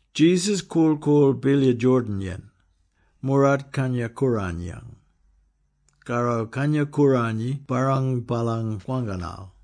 Jesus korl-koorl Bilya Jordan-yen, moorart Kangya-Kooranyang. Karro Kangya-Kooranyi barrang baalany kwangkanal.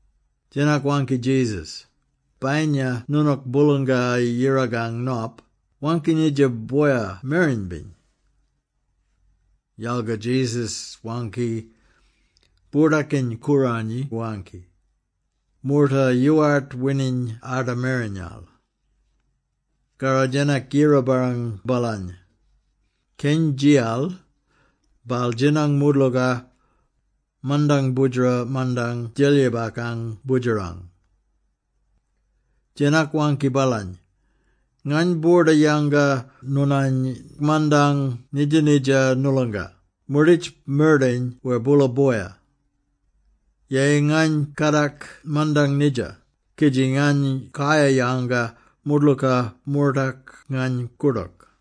Djenak waangki Jesus, “Bayinya noonook Boolanga-Yirakang Nop, waangki nidja boya mereny-biny.” Yalga Jesus waangki, “Boordakiny-Kooranyi waangki, ‘Moorta yoowart wining arda merenyal.’” Karro Djenak yira-barrang baalany. Keny djiyal, baal djinang moodlooka, mandang boodjera mandang djelyibakang Boodjerang. Djenak waangki baalany, “Ngany boorda yanga noonany mandang nidja-nidja noolonga, moorditj mardayin wer boola boya. Yeyi ngany kadak mandang nidja, kidji ngany kayar-yanga moodlooka moortak ngany koordook.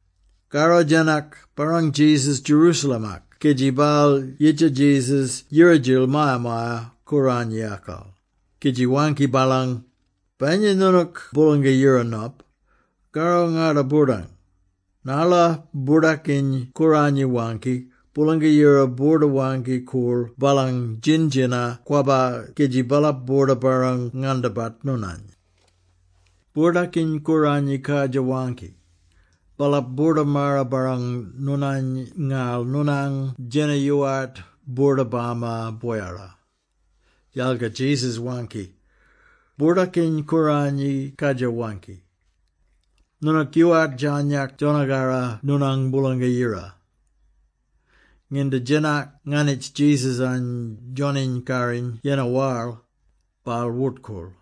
Karro Djenak barrang Jesus Jerusalem-ak kidji baal yidja Jesus yira-djil Maya-maya-Kooranyikal, kidji waangki baalany, “Bayinya noonook Boolanga-Yirang Nop, karro ngarda-boordang, narla Boordakiny-Kooranyi waangki, ‘Boolanga-Yira boorda-waangki-koorl baalang djin-djina-kwabba kidji baalap boorda-barrang-ngandabat noonany.’ Boordakiny-Kooranyi kadjir waangki, ‘Baalap boorda-maara-barrang noonany, ngarl noonang djena yoowart boorda-bama boyara.’” Yalga Jesus waangki, “Boordakiny-Kooranyi kadjir waangki, ‘Noonook yoowart djarnyak djona-karra noonang Boolanga-Yira.’” Nginda Djenak nganitj Jesus-any djoniny-karriny yennar waral, baal wort-koorl.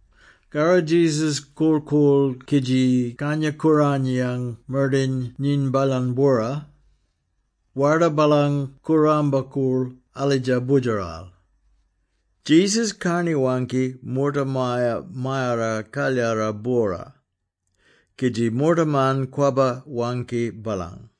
Karro Jesus korl-koorl kidji Kangya-Kooranyiyang mardayin nyiny baalany-bwora. Warda baalang kooramba-koorl alidja boodjeral. Jesus karni-waangki moorta Maya-mayara-Kalyara-bwora, kidji moortaman kwabba-waangki baalang.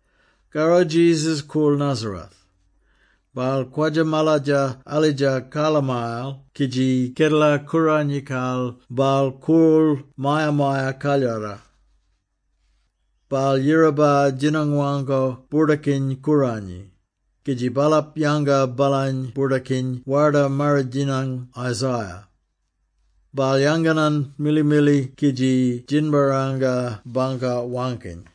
Karro Jesus koorl Nazareth. Baal kwadja-maladja alidja karlamayal, kidji Kedela-Kooranyikal, baal koorl Maya-maya-Kalyara. Baal yiraba djinang-waangko Boordakiny-Kooranyi, kidji baalap yanga baalany boordakiny Warda-Marridjinyang Isaiah. Baal yanganan mili-mili kidji djinbarranga bangka waangkiny: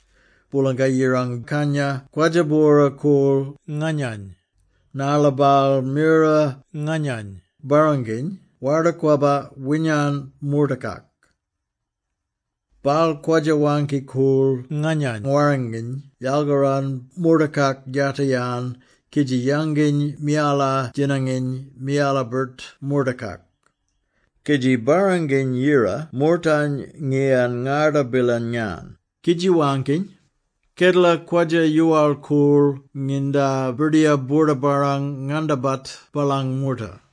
“Boolanga-Yirang Kangya kwadja bwora-koorl nganyany, narla baal mira nganyany barranginy Warda-Kwabba winyan moortakak. Baal kwadja waangki-koorl nganyany warranginy yalkaran moortakak yatar-yan kidji yanginy miyala-djinanginy miyala-birt moortakak, kidji barranginy-yira moortany ngiyan ngarda-bilang-yan, kidji waangkiny, ‘Kedela kwadja yoowal-koorl nginda Birdiyar boorda-barrang-ngangandabat baalang moorta.’”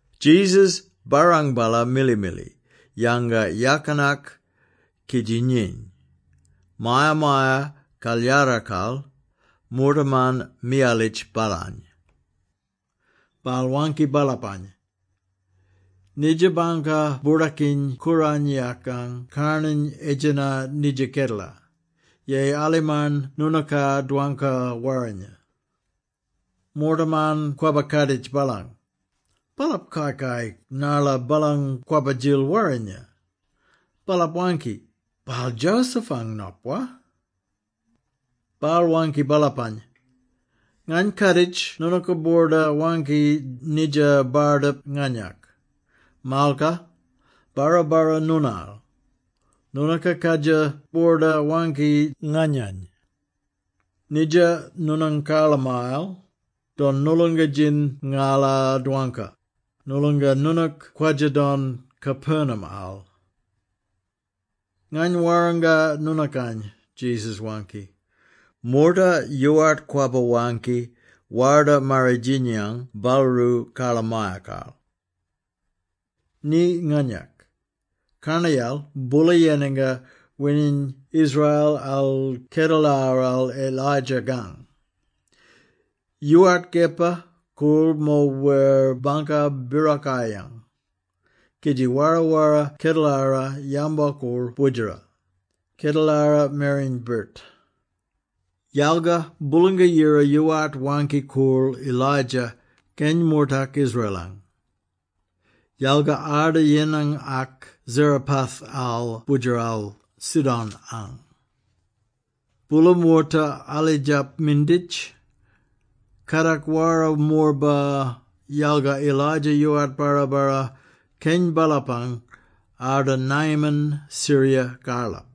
Jesus barrang-ballar mili-mili, yanga yakinak, kidji nyiny. Maya-maya-Kalyarakal, moortaman miyalitj baalany. Baal waangki baalapany, “Nidja bangka Boordakiny-Kooranyikang karnany edjena nidja kedela, yeyi alimarn noonooka dwangka warrinya.” Moortaman kwabba-kaaditj baalang. Baalap kai-kai narla baalang kwabba-djil warrinya. Baalap waangki, “Baal Joseph-ang nop, wa?” Baal waangki baalapany, “Ngany kaaditj noonooka boorda waangki nidja bardip nganyak, ‘Malka, barra-barra noonaal!’ Noonooka kadjir boorda waangki nganyany, ‘Nidja noonang karlamayal, don noolonga-djin ngala dwangka, noolonga noonook kwadja don Capernaum-al.’” “Ngany warranga noonookany,” Jesus waangki, “Moorta yoowart kwabba-waangki Warda-Marridjinyang baalroo karlamayakal. Ni nganyak! Karnayal, boola yenanga wining Israel-al kedelaral Elijah-kang. Yoowart kepa koorl mo wer bangka birokayang, kidji wara-wara kedelara yambo-koorl boodjera, kedelara mereny-birt. Yalga Boolanga-Yira yoowart waangki-koorl Elijah keny moortak Israel-ang, yalga arda yenangak Zarephath-al boodjerakal Sidon-ang. Boola moorta alidjap minditj, kadak wara-morba, yalga Elijah yoowart barra-barra keny baalapang, arda Naaman Syria-karlap.”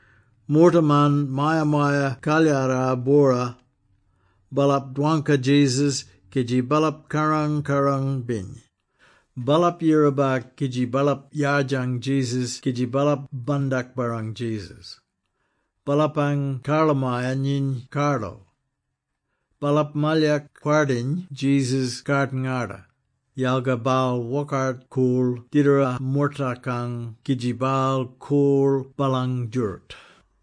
Moortaman Maya-maya-Kalyara-bwora, baalap dwangka Jesus kidji baalap kaarang-kaarang-biny. Baalap yiraba kidji baalap yardjang Jesus kidji baalap bandak-barrang Jesus. Baalapang karlamaya nyiny kardal. Baalap malyak kwardiny Jesus kard-ngarda, yalga baal wokart-koorl didara mortakang kidji baal koorl baalang djooroot.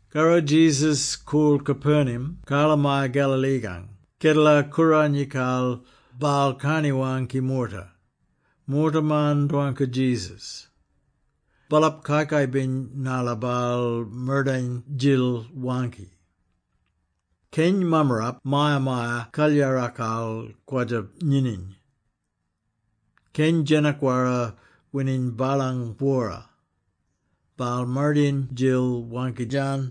Karro Jesus koorl Capernaum, karlamaya Galilee-kang. Kedela-Kooranyikal, baal karni-waangki moorta. Moortaman dwangka Jesus. Baalap kai-kai-biny narla baal mardayin-djil waangki. Keny mammarap Maya-maya-Kalyarakal kwadja-nyinyiny. Keny djenak-wara wining baalany-bwora. Baal mardayin-djil waangki-djan: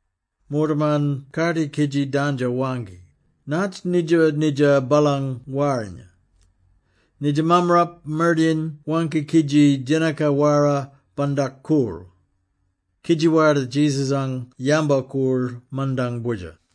Moortaman kardi kidji dandjo-waangki, “Natj nidja-nidja baalang warrinya? Nidja mammarap mardayin waangki kidji djenaka-wara bandak-koorl!” Kidji warda Jesus-ang yambo-koorl mandang boodjer.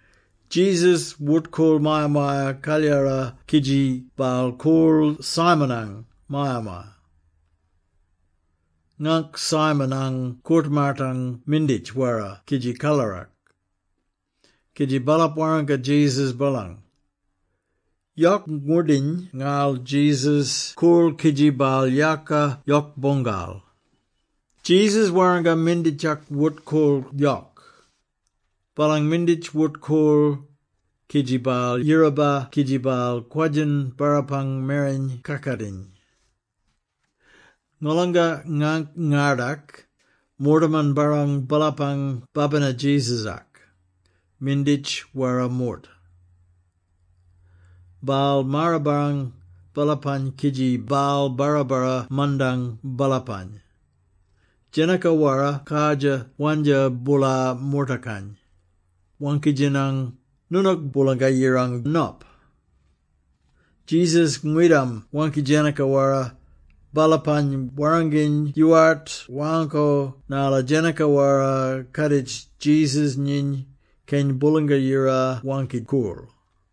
Jesus wort-koorl Maya-maya-Kalyara kidji baal koorl Simon-ang maya-maya. Ngaangk Simon-ang koort-maatang minditj-wara kidji kalarak, kidji baalap warranga Jesus baalang. Yok ngwoordiny ngarl Jesus koorl kidji baal yaaka yok-boongal. Jesus warranga minditjak wort-koorlo yok. Baalang minditj wort-koorl, kidji baal yiraba kidji baal kwadjin baalapang mereny kakatiny. Ngolanga ngangk-ngardak, moortaman barrang baalapang babina Jesus-ak, minditj-wara moorta. Baal maar-barrang baalapany kidji baal barra-barra mandang baalapany. Djenaka-wara kardjir wandja boola moortakany, waangki-djaniny, “Noonook Boolanga-Yirang Nop!” Jesus ngwidam waangki djenaka-wara, baalapany warranginy yoowart waangko narla djenaka-wara kaaditj Jesus nyiny Keny Boolanga-Yira Waangki-Koorl.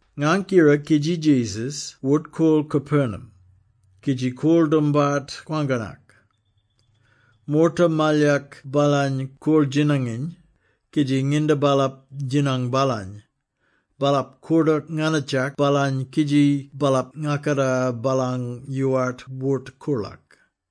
Ngangk-yira kidji Jesus wort-koorl Capernaum, kidji koorl doombart kwangkanak. Moorta malyak baalany koorl-djinanginy, kidji nginda baalap djinang baalany, baalap koordook nganitjak baalany kidji baalap ngakaka baalany yoowart wort-koorlak.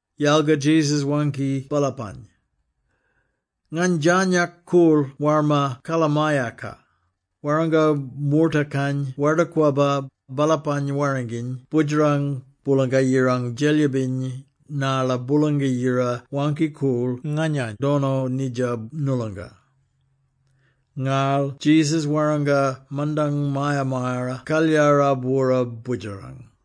Yalga Jesus waangki baalapany, “Ngany djarnyak koorl warma karlamayaka, warrango mortakany Warda-Kwabba, baalapany warranginy Boodjerang Boolanga-Yirang Djelyibiny, narla Boolanga-Yira waangki-koorl nganyany dono nidja noolonga.” Ngarl Jesus warranga mandang Maya-mayara-Kalyara-bwora boodjerang.